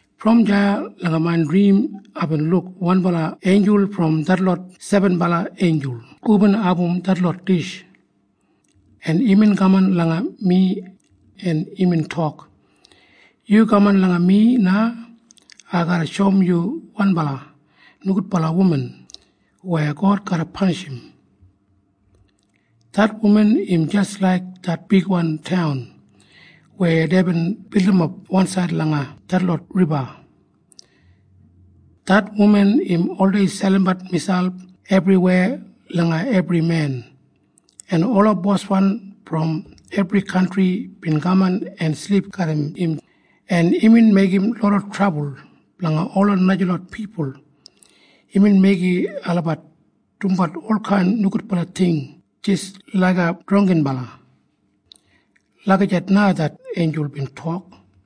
Brom deya langa main drim aibin luk wanbala einjul brom detlot sebenbala einjul hubin abum detlot dish, en imbin kaman langa mi, en imbin tok, “Yu kaman langa mi na. Ai garra shoum yu wanbala nogudbala wuman weya God garra panishim. Det wuman im jis laik det bigwan taun weya deibin bildimap wansaid langa detlot riba. Det wuman im oldei selimbat miselp ebriweya langa ebri men, en ola boswan brom ebri kantri bin kaman en silip garram im, en imbin meigim loda trabul blanga ola najalot pipul. Imbin meigim olabat dumbat olkain nogudbala ting jis laiga drangginbala.” Lagijat na det einjul bin tok.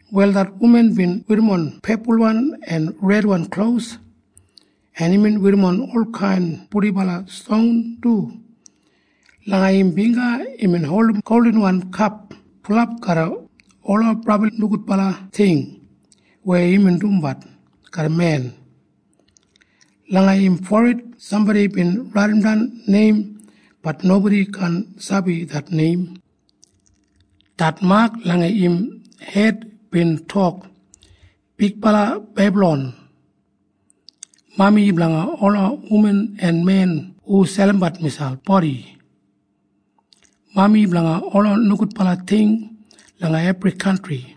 Wal det wuman bin werrimon pepulwan en redwan klos, en imbin werrimon olkain purdibala ston du. Langa im bingga imbin holdim goldinwan kap bulap garram ola brabli nogudbala ting weya imbin dumbat garram men. Langa im forid sambodi bin raidimdan neim. Bat nobodi kaan sabi det neim. Det mak langa im hed bin tok, “Bigbala Bebalon. Mami blanga ola wuman en men hu selimbat miselp bodi. Mami blanga ola nogudbala ting langa ebri kantri.”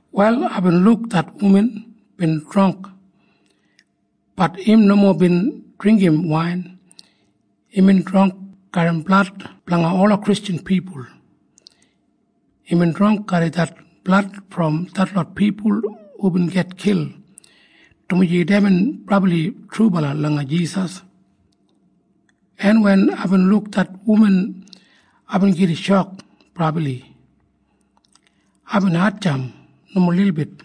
Wal aibin luk det wuman bin drangk. Bat im nomo bin dringgim wain. Imbin drangk garram blad blanga ola Kristjan pipul. Imbin drangk garram det blad brom detlot pipul hubin gitkil dumaji deibin brabli trubala langa Jisas. En wen aibin luk det wuman, aibin gida shok brabli. Aibin hatjamp nomo lilbit.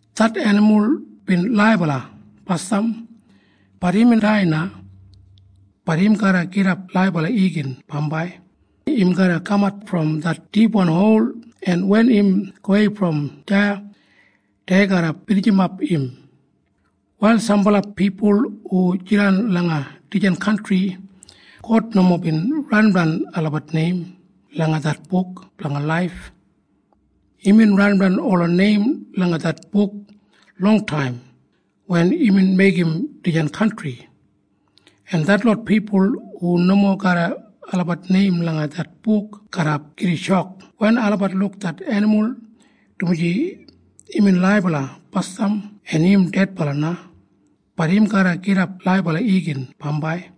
Det enimul bin laibala basdam. Bat imbin dai na. Bat im garra gidap laibala igin bambai. Im garra kamat brom det dipwan hol, en wen im gowei brom deya, dei garra binijimap im. “Wal sambala pipul hu jidan langa dijan kantri, God nomo bin raidimdan olabat neim langa det Buk Blanga Laif. Imbin raidimdan ola neim langa det buk longtaim wen imbin meigim dijan kantri, en detlot pipul hu nomo garram olabat neim langa det buk garra gida shok wen olabat luk det enimul, dumaji imbin laibala basdam en im dedbala na. Bat im garra gidap laibala igin bambai.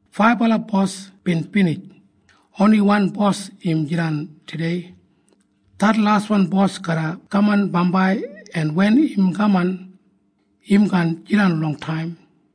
Faibala bos bin binij. Oni wan bos im jidan tudei. Det laswan bos garra kaman bambai, en wen im kaman, im kaan jidan longtaim.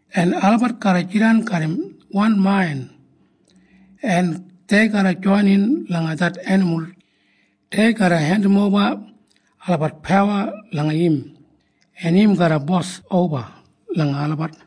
En olabat garra jidan garram wan main, en dei garra joinin langa det enimul. Dei garra hendimoba olabat pawa langa im, en im garra bos oba langa olabat.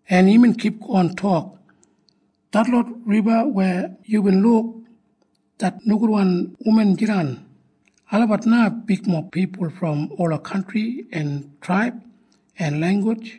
En imbin kipgon tok, “Detlot riba weya yubin luk det nogudwan wuman jidan, olabat na bigmob pipul brom ola kantri en traib en langgus.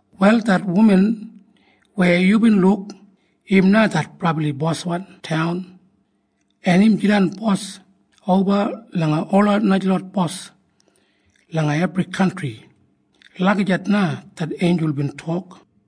“Wal det wuman weya yubin luk, im na det brabli boswan taun, en im jidan bos oba langa ola najalot bos langa ebri kantri.” Lagijat na det einjul bin tok.